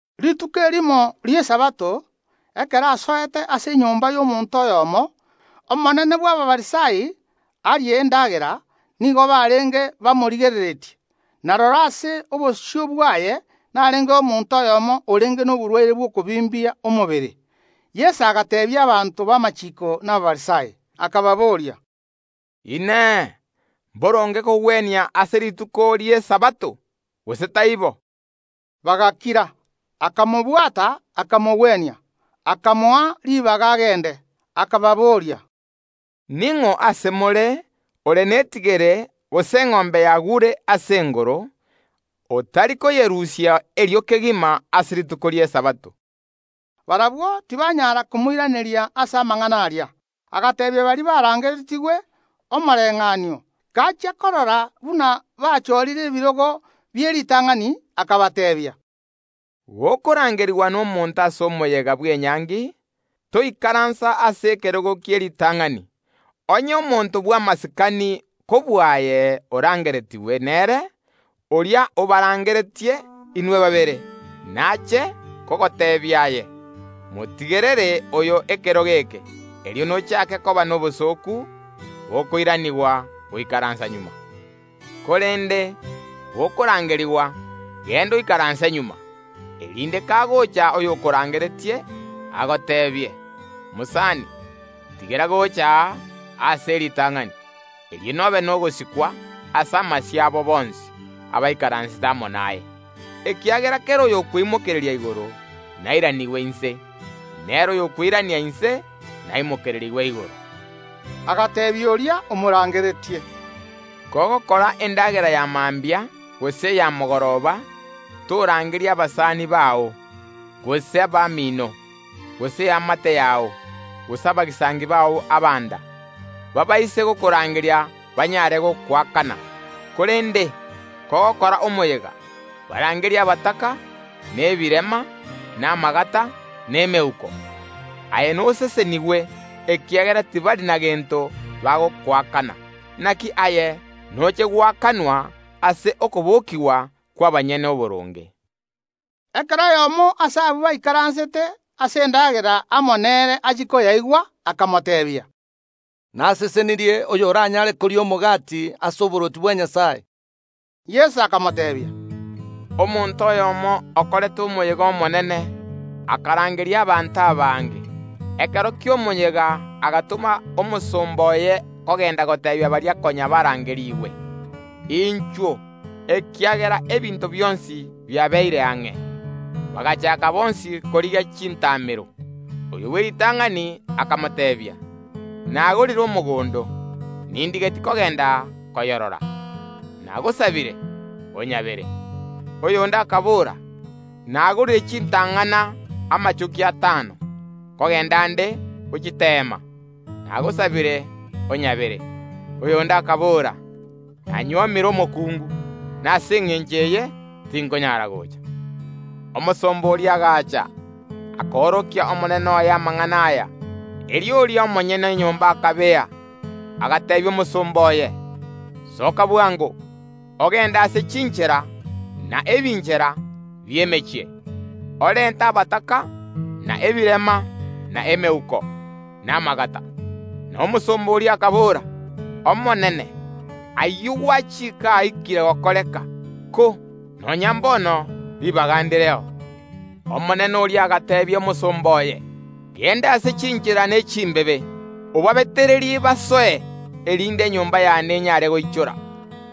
Rituko erimo ri’Esabato, ekero asoete ase enyomba y’omonto oyomo, omonene bw’Abafarisai, arie endagera, nigo barenge bamorigereretie. Na rora, ase obosio bwaye narengeo omonto oyomo orenge noborwaire bw’okobimbia omobere. Yeso agateebia abanto b’amachiiko na Abafarisai, akababoria, “Inee! Mboronge kogwenia ase rituko ri’Esabato, gose taibo?” Bagakira. Akamobwata, akamogwenia, akamoa ribaga agende. Akababoria, “Ning’o ase more ore netigere gose eng’ombe yagure ase engoro, otari koyerusia erio kegima ase rituko ri’Esabato?” Barabwo tibanyara komoiraneria ase amang’ana aria. Agateebia baria barangeretigwe omoreng’anio, gachia korora buna bachorire ebirogo bi’eritang’ani, akabateebia, “Gokorangerigwa nomonto ase omoyega bw’enyangi, toikaransa ase ekerogo kie ritang’ani; onye omonto bw’amasikani kobua aye orangeretigwe nere, oria obarangeretie inwe babere nache kogoteebia aye: Motigerere oyo ekerogo eke; erio nochake koba nobosooku gokoiranigwa goikaransa magega. Korende gokorangerigwa, genda oikaranse magega, erinde kagocha oyokorangeretie, agoteebie: Mosani, tigera gocha aa aase e ritang’ani. Erio nobe nogosikwa ase amasio abo bonsi abaikaransete amo naye. Ekiagera kera oyokweimokereria igoro nairanigwe inse, na ere oyokweirania inse naimokererigwe igoro.” Agateebia oria omorangeretie, “Kogokora endagera ya mambia gose eya mogoroba, torangeria abasani bao, gose abamino, gose eamate yao, gose abagisangio bao abanda; baabaise gokorangeria banyare gokoakana. Korende kogokora omoyega, barangerie abataka, na ebirema, na amagata, na emeuko; aye nosesenigwe, ekiagera tibari na gento bagokoakana. Naki aye noche goakanwa ase okobokigwa kw’abanyene oboronge.” Ekero oyomo ase abwo baikaransete ase endagera amo nere achia koyaigwa akamoteebia, “Nasesenirie oyoranyare koria omogati ase oborwoti bwa Nyasae!” Yeso akamoteebia, “Omonto oyomo okorete omoyega omonene; akarangeria abanto abange. Ekero ki’omoyega agatoma omosomba oye kogenda goteebia baria konya barangerigwe: Inchuo, ekiagera ebinto bionsi biabeire ang’e. Bagachaaka bonsi korigia chintamero. Oyo bw’eritang’ani akamoteebia: Nagorire omogondo, nindigetie kogenda koyorora; nagosabire, onyabere. Oyonde akabora: Nagorire chintang’ana amachoki atano, nkogenda nde gochiteema; nagosabire, onyabere. Oyonde akabora: Nanyuomire omokungu, na ase engencho eye tinkonyara gocha. Omosomba oria agacha, akorokia omonene oye amang’ana aya. Erio oria omonyene enyomba akabea, agateebia omosomba oye: Soka bwango, ogende ase chinchera na ebinchera bi’emechie, orente abataka, na ebirema, na emeuko, na amagata. Na omosomba oria akabora: Omonene, ayio gwachika aikire gokoreka, ko nonya mbono ribaga ndireo. Omonene oria agateebia omosomba oye: Genda ase chinchera ne chimbebe, obabetererie basoe, erinde enyomba yane enyare goichora.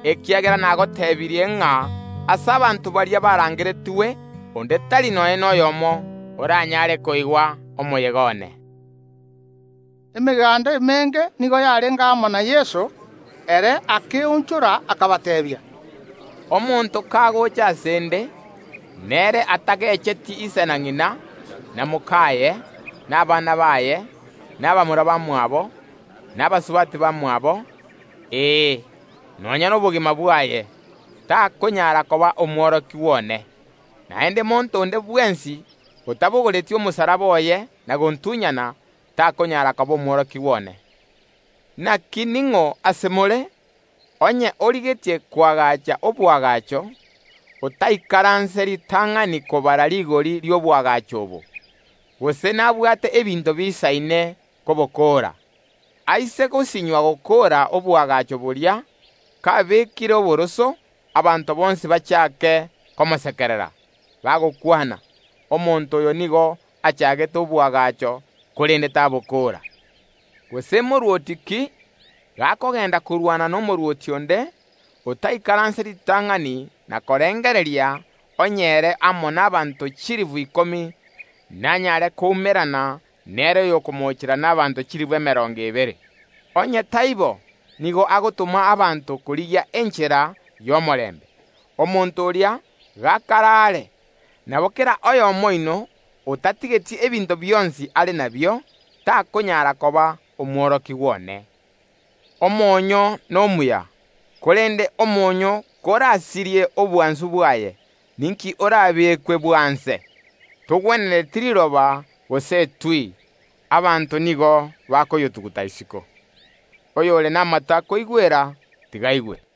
Ekiagera nagotebirie ng’a ase abanto baria barangeretigwe onde tari nonya noyomo oranyare koigwa omoyega one.” Emeganda emenge nigo yarenge amo na Yeso; ere akeonchora, akabateebia, “Omonto kagocha ase ’nde, nere atagecheti ise na ng’ina, na mokaye, na abana baye, na abamura bamwabo, na abasubati bamwabo, ee, nonya nobogima bwaye, takonyara koba omworokigwa one. Naende monto onde bwensi otabogoreti omosalaba oye na gontunyana, takonyara koba omworokigwa one. Naki ning’o ase more, onye origetie koagacha oboagacho, otaikaranse ritang’ani kobara rigori ri’oboagacho obo, gose nabwate ebinto biisaine kobokoora? Aise gosinywa gokoora oboagacho boria kabekire oboroso, abanto bonsi bachake komosekerera, bagokwana: Omonto oyo nigo achagete oboagacho, korende tabokoora. Gose morwoti ki, gakogenda korwana nomorwoti onde, otaikaranse ritang’ani na korengereria onye ere amo nabaanto chilifu ikomi nanyare koumerana nere oyokomocheera nabaanto chilifu emerongo ebere? Onye taibo, nigo agotoma abanto korigia enchera y’omorembe, omonto oria gakare aare. Nabo kera oyomo oino otatigeti ebinto bionsi are nabio, takonyara koba omworokigwa one. “Omonyo nomuya, korende omonyoo korasirie obwansu bwaye, ninki orabekwe bwanse? Togwenereti riroba gose etui; abanto nigo bakoyotuguta isiko. Oyore namato akoigwera, tiga aigwe.”